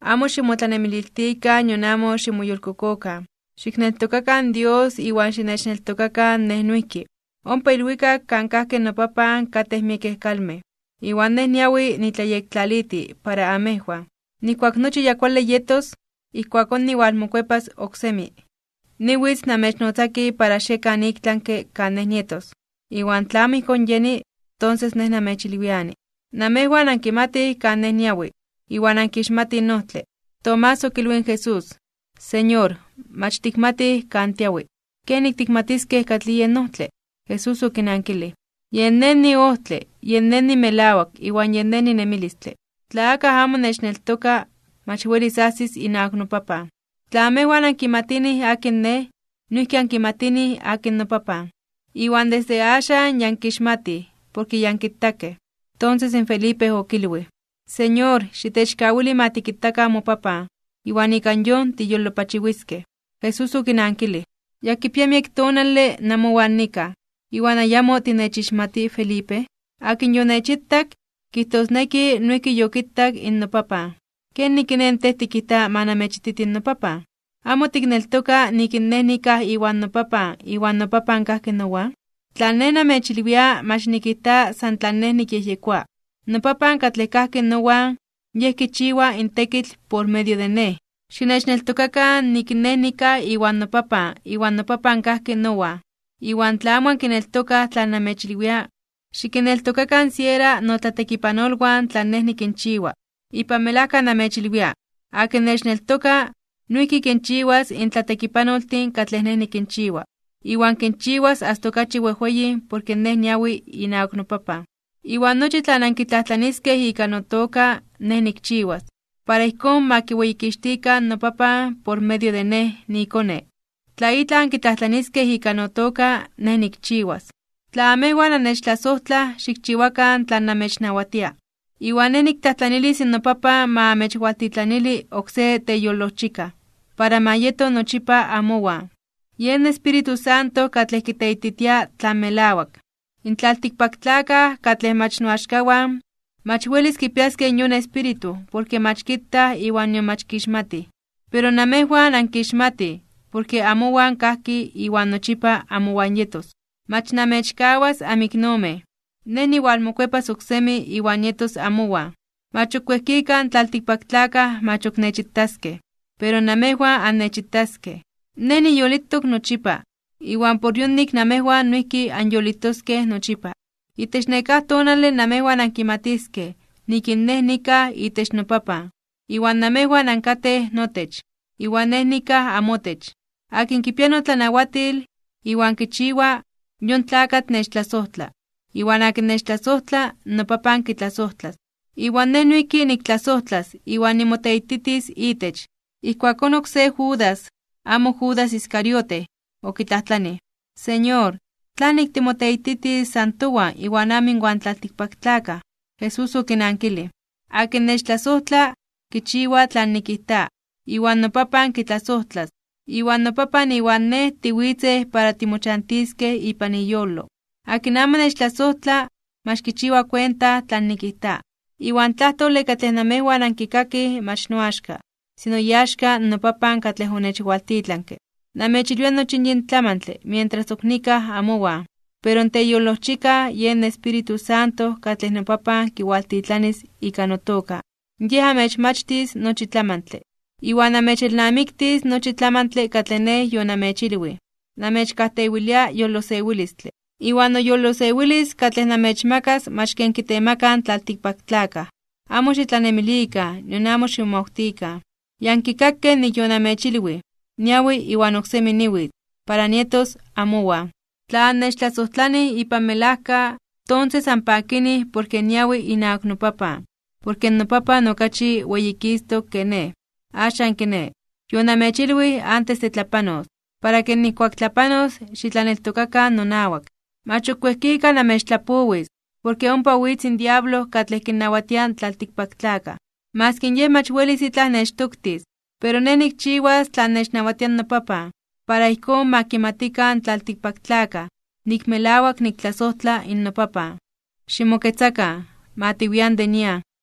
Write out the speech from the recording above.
’Amo ximotlanemililtikan nion amo ximoyolkokokan. Xikneltokakan Dios iwan xinechneltokakan Nej noijki. Ompa ilwikak kan kajki noPapan katej miekej kalmej, iwan Nej niawi nitlayektlaliti para amejwan. Nijkuak nochi ya kuale yetos, ijkuakón niwalmokuepas oksemi. Niwitz namechnotzaki para xiekan iktlanke (ik tlami) kan Nej nietos. Iwan tla amo ijkón yeni, tonses Nej namechyekilwiani. Namejwan ankimatij kan Nej niawi, iwan ankixmatij in ojtle. Tomás okilwij in Jesús: ―Señor, mach tikmatij kan tiawi, ¿kenik tikmatiskej katlij yen ojtle? Jesús okinankilij: ―Yen Nej niojtle, yen Nej nimelawak iwan yen Nej ninemilistle. Tla akaj amo nechneltoka, mach welis ajsis inawak noPapan. Tla amejwan ankimatinij akin Nej, noijki ankimatinij akin noPapan. Iwan desde axan ya ankixmatij, porke ya ankitakej. Tonses in Felipe okilwij: ―Señor, xitechkawili ma tikitakan moPapan, iwan ika yon tiyolopachiwiskej. Jesús okinankilij: ―Yakipia miek tonale namowan nikaj, ¿iwan ayamo tinechixmati Felipe? Akin yonechitak, kijtosneki noijki yokitak in noPapan. ¿Kenik kiné in tej tikijta ma nanmechititi in noPapan? ¿Amo tikneltoka nik in Nej nikaj iwan noPapan iwan noPapan kajki nowan? Tlan Nej namechilwia mach nikijta san tlan Nej nikyejyekoa. NoPapan katlej kajki nowan, yen kichiwa in tekitl por medio de Nej. Xinechneltokakan nik Nej nikaj iwan noPapan iwan noPapan kajki nowan. Iwan tla amo ankineltokaj tlan namechilwia, xikinneltokakan siera notlatekipanolwan tlan Nej nikinchiwa. Ipan melajka namechilwia, akin nechneltoka, noijki kinchiwas in tlatekipanoltin katlej Nej nikinchiwa, iwan kinchiwas asta okachi wejweyin porke Nej niawi inawak noPapan. Iwan nochi tlan ankitlajtlaniskej ika notoka, Nej nikchiwas, para ijkón ma kiweyikixtikan noPapan por medio de Nej niiKone. Tla itlaj ankitlajtlaniskej ika notoka, Nej nikchiwas. ’Tla amejwan annechtlasojtlaj, xikchiwakan tlan namechnawatia. Iwan Nej niktlajtlanilis noPapan ma amechwaltitlanili oksé Teyolojchikaj, para ma yeto nochipa amowan, Yen Espíritu Santo katlej kiteititia tlan melawak. In tlaltikpaktlakaj katlej mach noaxkawan, mach welis kipiaskej yon Espíritu porke mach kitaj iwan nion mach kixmatij. Pero namejwan ankixmatij, porke amowan kajki iwan nochipa amowan yetos. ’Mach namechkawas amiknomej. Nej niwalmokuepas oksemi iwan nietos amowan. Mach ok wejkika in tlaltikpaktlakaj mach ok nechitaskej. Pero namejwan annechitaskej. Nej niyolitok nochipa, iwan por yonik namejwan noijki anyolitoskej nochipa. Itech nekáj tonale namejwan ankimatiskej nik in Nej nikaj itech noPapan, iwan namejwan ankatej notech, iwan Nej nikaj amotech. Akin kipia notlanawatil, iwan kichiwa, yon tlakatl nechtlasojtla. Iwan akin nechtlasojtla, noPapan kitlasojtlas, iwan Nej noijki niktlasojtlas iwan nimoteititis itech. Ijkuakón oksé Judas (amo Judas Iscariote) okitlajtlanij: ―Señor, ¿tlanik timoteititis san towan iwan amo inwan tlaltikpaktlakaj? Jesús okinankilij: ―Akin nechtlasojtla, kichiwa tlan nikijta. Iwan noPapan kitlasojtlas, iwan noPapan iwan Nej tiwitzej para timochantiskej ipan iyolo. Akin amo nechtlasojtla, mach kichiwa kuenta tlan nikijta. Iwan in tlajtole katlej namejwan ankikakij mach noaxka, sino iaxka in noPapan katlej onechwaltitlanke. ’Namechilwia nochi yin tlamantle mientras ok nikaj amowan. Pero in Teyolojchikaj, yen Espíritu Santo katlej noPapan kiwaltitlanis ika notoka, Yej amechmachtis nochi tlamantle. Iwan amechelnamiktis nochi tlamantle katlej Nej yonamechilwij. ’Namechkajtewilia yolosewilistle. Iwan noyolosewilis katlej namechmakas mach ken kitemakaj in tlaltikpaktlakaj. Amo xitlanemilikan nion amo ximomawtikan. Ya ankikakej nik yonamechilwij nik niawi, iwan oksemi niwitz para nietos amowan. Tla annechtlasojtlanij ipan melajka, tonses anpakinij porke niawi inawak noPapan. Porke noPapan okachi weyikistok ke Nej. Axan kiné, yonamechilwij antes de tlapanos, para ke nijkuak tlapanos xitlaneltokakan nonawak. ’Mach ok wejkika namechtlapowis, porke ompa witz in diablo katlej kinnawatia in tlaltikpaktlakaj. Maski yej mach welis itlaj nechtoktis. Pero Nej nikchiwas tlan nechnawatia noPapan, para ijkón ma kimatikan in tlaltikpaktlakaj nik melawak niktlasojtla noPapan. Ximoketzakan. Ma tiwian de nian.